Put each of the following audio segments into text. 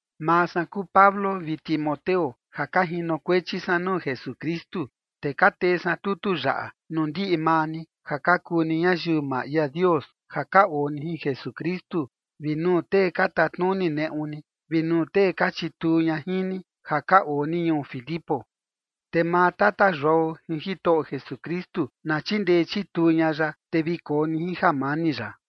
Maa san kuu Pablo vi Timoteo ja ka jinokuechi san nuu Jesukristu, te ka tee san tutu yaꞌa nuu ndiꞌi maa ni ja ka kuu ni ñayiu maa ia Dios ja ka oo ni jin Jesukristu, vi nuu tee ka tatnuni neꞌu ni, vi nuu tee ka chituu ña jin ni, ja ka oo ni ñuu Filipo. Te maa Tata Yuao jin Jitoꞌo Jesukristu na chindee chituu ña ya, te vi koo ni jin jamani ya.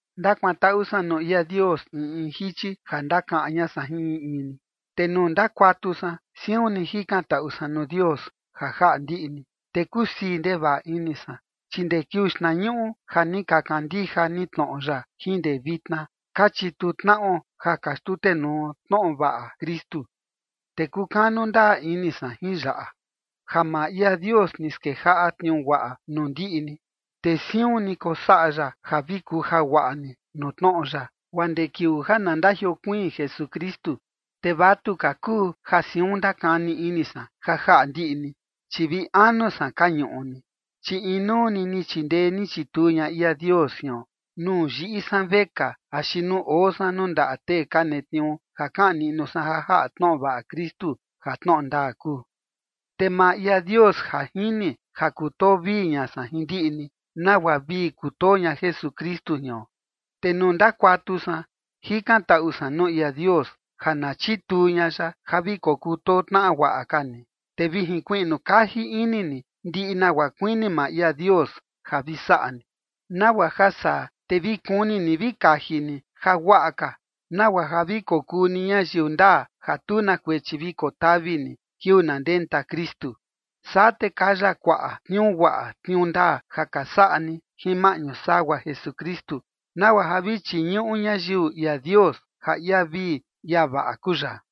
Ndakuantaꞌu san nuu ia Dios in in jichi ja ndakaꞌan ña san jin in in ni. Te nuu ndakuatu san, siun ni jikantaꞌu san nuu Dios ja jaꞌa ndiꞌi ni, te kusii ndevaꞌa ini san. Chi ndee kiuu xtnañuꞌu ja ni ka kandija ni tnoꞌo ya jin ndee vitna, ka chituu tnaꞌo ja ka xtutenuo tnoꞌo vaꞌa Kristu. Te kukanu ndaa ini san jin yaꞌa: Ja maa ia Dios ni skejaꞌa tniuu guaꞌa nuu ndiꞌi ni, te siun ni kosaꞌa ya ja vi kuja guaꞌa ni nuu tnoꞌo ya, guaa ndee kiuu ja na ndajiokuiin Jesukristu. Te vatu ka kuu ja siun ndakani ini san ja jaꞌa ndiꞌi ni, chi vi anu san ka ñuꞌu ni, chi inuu ni ni chindee ni chituu ña ia Dios jion, nuu yiꞌi san vekaa axi nuu oo san nuu ndaꞌa tee ka netniuu ja kaꞌan niꞌnu san ja jaꞌa tnoꞌo vaꞌa Kristu ja tnoꞌo ndaa kuu. Te maa ia Dios ja jini ja kutoo vii ña san jin ndiꞌi ni, nagua vii kutoo ña Jesukristu jion. Te nuu ndakuatu san, jikantaꞌu ña san nuu ia Dios ja na chituu ña ya ja vi kokutoo tnaꞌa guaꞌa ka ni, te vi jinkuiꞌnu kaji ini ni ndiꞌi nagua kuini maa ia Dios ja vi saꞌa ni. Nagua ja saa, te vi kuni ni vi kaji ni jaguaꞌa ka, nagua ja vi kokuu ni ñayiu ndaa, ja tu na kuechi vi kotavi ni kiuu na ndenta Kristu. Saa, te kaya kuaꞌa tniuu guaꞌa tniuu ndaa ja ka saꞌa ni jin maꞌñu sagua Jesukristu, nagua ja vi chiñuꞌu ñayiu ia Dios ja ia vii ia vaꞌa kuu ya.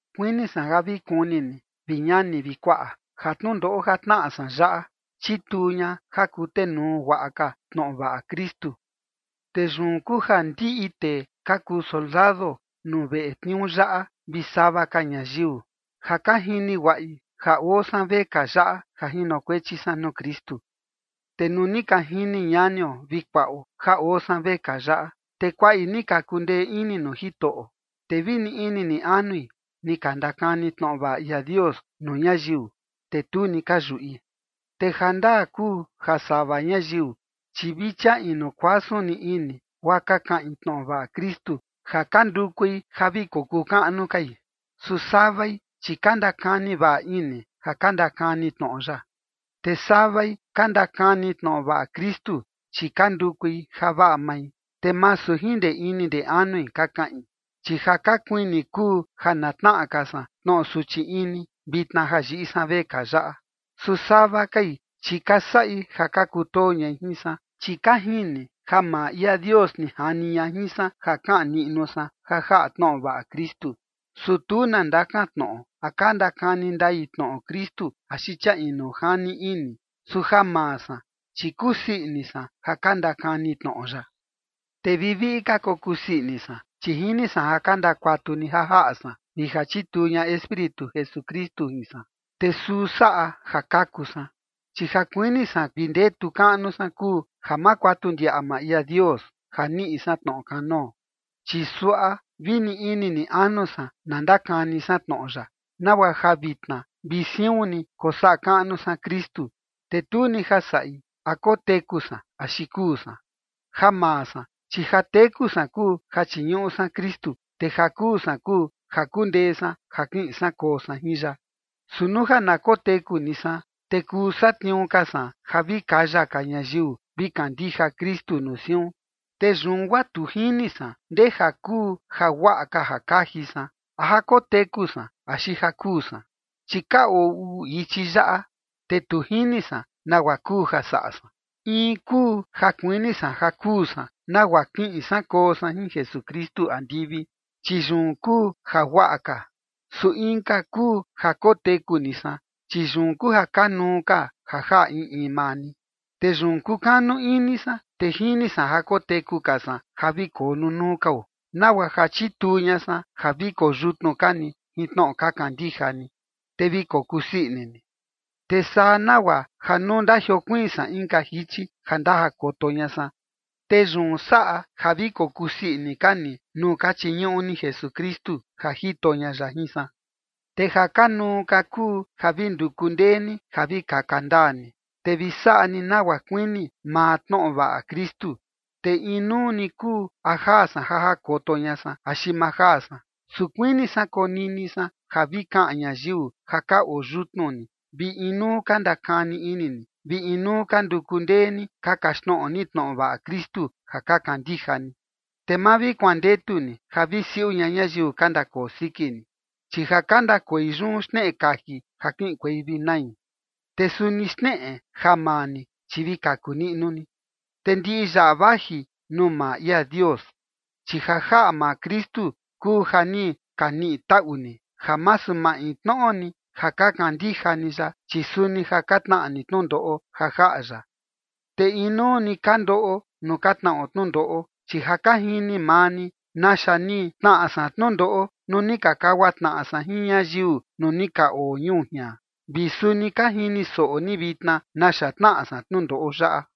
Kuini san ja vi kuni ni, vi ñani vi kuaꞌa, ja tnundoꞌo ja tnaꞌa san yaꞌa chituu ña ja kutenuu guaꞌa ka tnoꞌo vaꞌa Kristu. Te yun kuu ja ndiꞌi tee ka kuu soldado nuu veꞌe tniuu yaꞌa vi sava ka ñayiu, ja ka jini guaꞌi ja oo san vekaa yaꞌa ja jinokuechi san nuu Kristu. Te nuu ni ka jini ñanio vi kuaꞌo ja oo san vekaa yaꞌa, te kuaꞌi ni ka kundee ini nuu Jitoꞌo, te vi ni ini ni anui ni ka ndakani tnoꞌo vaꞌa ia Dios nuu ñayiu, te tu ni ka yuꞌi. Te jandaa kuu ja sava ñayiu, chi vi chia inu kuasun ni ini, guaa ka kaꞌin tnoꞌo vaꞌa Kristu, ja ka ndukui ja vi kokuu kaꞌnu kai. Su savai, chi ka ndakani vaꞌa ini ja ka ndakani tnoꞌo ya. Te savai ka ndakani tnoꞌo vaꞌa Kristu, chi ka ndukui ja vaꞌa mai, te masu jin ndee ini ndee anui ka kaꞌin, chi ja ka kuini kuu ja na tnaꞌa ka san tnoꞌo suchi ini, vitna ja yiꞌi san vekaa yaꞌa. Su sava kai, chi ka saꞌi ja ka kutoo ñai jin san, chi ka jini ja maa ia Dios ni jani ña jin san ja kaꞌan niꞌnu san ja jaꞌa tnoꞌo vaꞌa Kristu. Su tu na ndakantnoꞌo, a ka ndakani ndai tnoꞌo Kristu axi chia inu jani ini, su ja maa san, chi kusii ini san ja ka ndakani tnoꞌo ya. Te viviꞌi ka kokusii ini san. Chi jini san ja ka ndakuatu ni ja jaꞌa san vi ja chituu ña Espíritu Jesukristu jin san, te suu saꞌa ja kaku san. Chi ja kuini san vi ndetu kaꞌnu san kuu ja ma kuatu ndiaꞌa maa ia Dios ja niꞌi san tnoꞌo kanoo, chi suaꞌa vi ni ini ni anu san na ndakani san tnoꞌo ya, nagua ja vitna vi siun ni kosaꞌa kaꞌnu san Kristu, te tu ni ja saꞌi a koteku san axi kuu san. Ja maa san, chi ja teku san kuu ja chiñuꞌu san Kristu. Te ja kuu san kuu ja kundee san ja kiꞌin san koo san jin ya. Su nuu ja na koteku ni san, te kuu satniuu ka san ja vi kaya ka ñayiu vi kandija Kristu nuu siun. Te yun guaa tu jini san ndeja kuu jaguaꞌa ka ja kaji san, a ja koteku san axi ja kuu san. Chi ka oo uu ichi yaꞌa, te tu jini san nagua kuu ja saꞌa san: In kuu ja kuini san ja kuu san nagua kiꞌin san koo san jin Jesukristu andivi, chi yun kuu jaguaꞌa ka. Su inka kuu ja koteku ni san, chi yun kuu ja kanuu ka ja jaꞌa in in maa ni. Te yun kukanu ini san, te jini san ja koteku ka san ja vi koo nunuu kao, nagua ja chituu ña san ja vi koyutnu ka ni jin tnoꞌo ka kandija ni, te vi kokusii ini ni. Te saa nagua ja nuu ndajiokuiin san inka jichi ja ndajakoto ña san, te yun saꞌa ja vi kokusii ini ka ni nuu ka chiñuꞌu ni Jesukristu ja jito ña ya jin san. Te ja kanuu ka kuu ja vi nduku ndee ni ja vi kaka ndaa ni, te vi saꞌa ni nagua kuini maa tnoꞌo vaꞌa Kristu, te inuu ni kuu a jaa san ja jakoto ña san axi ma jaa san. Su kuini san konini san ja vi kaꞌan ñayiu ja ka oo yutnu ni, vi inuu ka ndakani ini ni, vi inuu ka nduku ndee ni ka kaxtnoꞌo ni tnoꞌo vaꞌa Kristu ja ka kandija ni. Te ma vi kuandetu ni ja vi siuꞌu ña ñayiu ka ndakoo siki ni, chi ja ka ndakoi yun xneꞌe kaji ja kiꞌinkuei vi nai, te suni xneꞌe ja maa ni, chi vi kaku niꞌnu ni, te ndiꞌi yaꞌa vaji nuu maa ia Dios. Chi ja jaꞌa maa Kristu kuu ja ni ka niꞌi taꞌu ni ja masu maintnoꞌo ni ja ka kandija ni ya, chi suni ja ka tnaꞌa ni tnundoꞌo ja jaꞌa ya. Te inuu ni ka ndoꞌo nuu ka tnaꞌo tnundoꞌo, chi ja ka jini maa ni naxa ni tnaꞌa san tnundoꞌo nuu ni ka kagua tnaꞌa san jin ñayiu nuu ni ka oo ñuu jian, vi suni ka jini soꞌo ni vitna naxa tnaꞌa san tnundoꞌo yaꞌa.